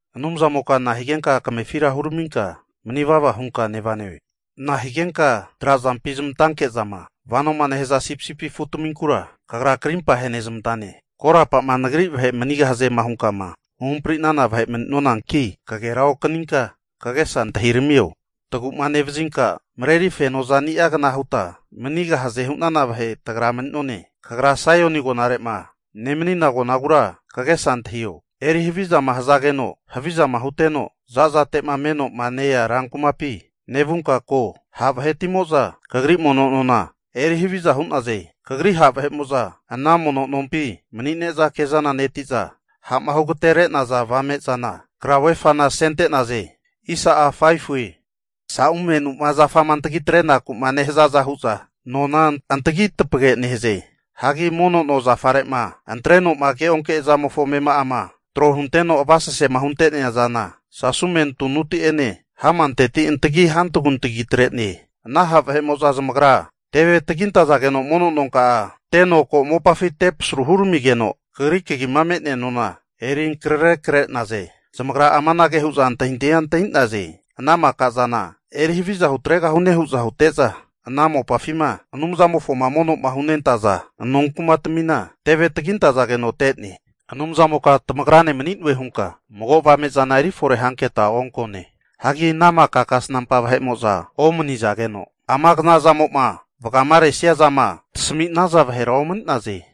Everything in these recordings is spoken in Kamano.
Anumzamoka nahigenka kamefira huraminka mani vava hunka nevane? Nahigenka trazampi zmantanke'zama vanoma nehaza sipisipi afutaminkura, Kagra krimpa ahenezmantane? Korapama Nagri vahe manigahaze hunkama huhampri'nana vahe mani'nonanki, kagera okaninka kagesa antahiramio. Tagu'ma nevazinka mareri fenozani'agna huta manigahaze hu'nana vahe tagra mani'none. Kagra Saioni agonarema nemanina agonagura (Jerusalemi) kagesa antahio. Eri havizama hazageno havizama huteno zazate'ma me'noma nea rankumapi, nevunka ko. Ha' vahetimo'za Kagri mono nona eri haviza hu'naze. Kagri ha' vahe'mo'za ana mono nompi mani'ne'za kezana neti'za, ha'ma hugatere'naza avame'zana, krauvefana (flek) asenentaze. Saumenuma zafama antagitre'naku'ma nehazaza hu'za nona antagi tapage nehaze. Hagi mono no zafare'ma antreno'ma keonke'zamofo amema'ama trohunteno avasasema hunte'nea zana, sasume tunuti'ene hamanteti antagi hantagutagi atre'ne. Ana ha' vahe'mo'za zamagra teve tagintazageno mono nonka'a teno ko mopafi tepasaru huramigeno, Kagri kagima me'nea nona eri ankrare kre'naze. Zamagra amanage hu'za antahintahia antahi'naze, ana maka zana eri haviza hutregahune hu'za hute'za, ana mopafima Anumzamofoma mono'ma hunentaza nonkumatamina teve tagintazageno te'ne. Anumzamoka tamagrane mani'noe hunka mago avamezana eri fore hanketa onkone. Hagi ana maka kasnampa vahe'mo'za omanizageno, ama knazamo'ma vagamaresia zama tasami'naza vahera omani'naze.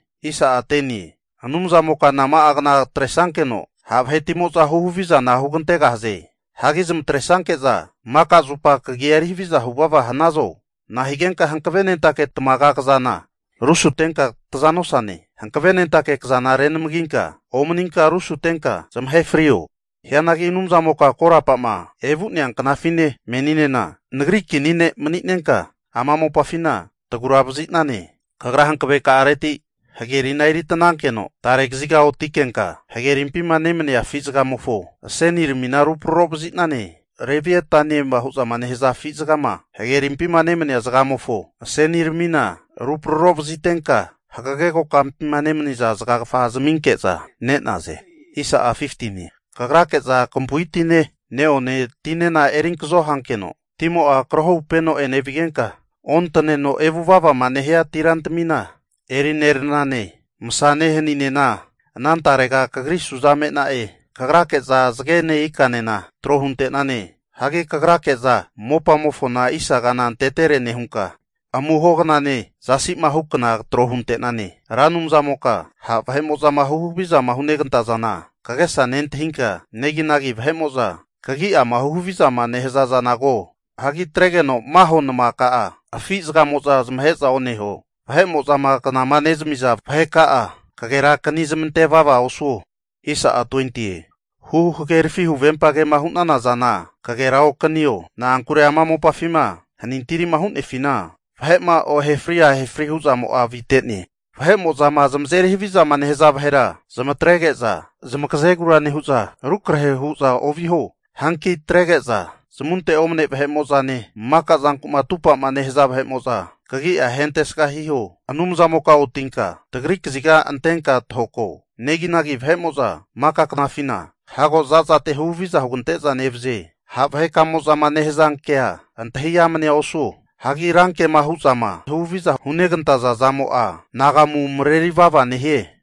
Anumzamoka nama'agna atresankeno ha' vahetimo'za huhavizana hugantegahaze? Hagi zamatre'sanke'za maka zupa kagia eri haviza huvava hanazo? Nahigenka hankavenentake tamaga kazana rusutenka taza nosane? Hanavenentake kazana renamaginka omaninka rusutenka zamahe frio. Hianagi Anumzamoka korapama evu'nea knafine meninena nagri kini ne' mani'nenka, ama mopafina tagura vazi'nane. Kagra hankaveka'areti hagerina eri atanankeno tare kaziga otikenka, hagerimpima nemania afizagamofo aseniramina rupraro vazi'nane. Laviataniema hu'za nehaza afi zagama hagerimpi nemania zagamofo aseniramina rupraro vazitenka, hagage kokampima nemaniza zagagafa zaminke'za ne'naze. Kagrake'za kampu'i tine, neone tinena erinkazo hankeno, timo'a krohupeno enevigenka, ontaneno evuvavama nehia tirantamina eri neranane. Masane, haninena anantarega kagri suza me'na'e. Kagrake'za zagene ikanena, tro hunte'nane. Kagrake'za mopamofona isagana antetere nehunka, amuho knane zasi'ma hu kna trohu ante'nane. Ra Anumzamoka ha' vahe'mo'zama huhavizama hunegantazana kagesa nentahinka, neginagi vahe'mo'zama kagi'ama huhaviza nehaza zana ko. Hagi atregeno maho namaka'a afi zagamo'za zamahe'za oneho. Vahe'mo'zama knama nezamiza vaheka'a kagerakani zamante vava osuo. Huhagerafi huvempa kema hu'nana zana kagera okanio. Na'ankure ama mopafima hanintirima hu'nefina, vahe'ma ohefri ahefrima hu'zamo'a avite. Vahe'mo'zama zamazeri havizama nehaza vahera zamatrege'za, zamagazegura nehu'za rukrahe hu'za oviho. Hanki atrege'za zamunte omne vahe'mo'zane, maka zanku'ma atupa'ma nehaza vahe'mo'za kagi'a ahentesga hiho. Anumzamoka otinka tagri kaziga antenka tahoko. Neginagi vahe'mo'za maka knafina, hago zazate huhaviza hugante'za nevaze. Ha' vahekamo'zama nehazankea antahi amnea osuo. Hagi ranke hu'zama huhaviza hunegantaza zamo'a anagamu mareri vava nehie.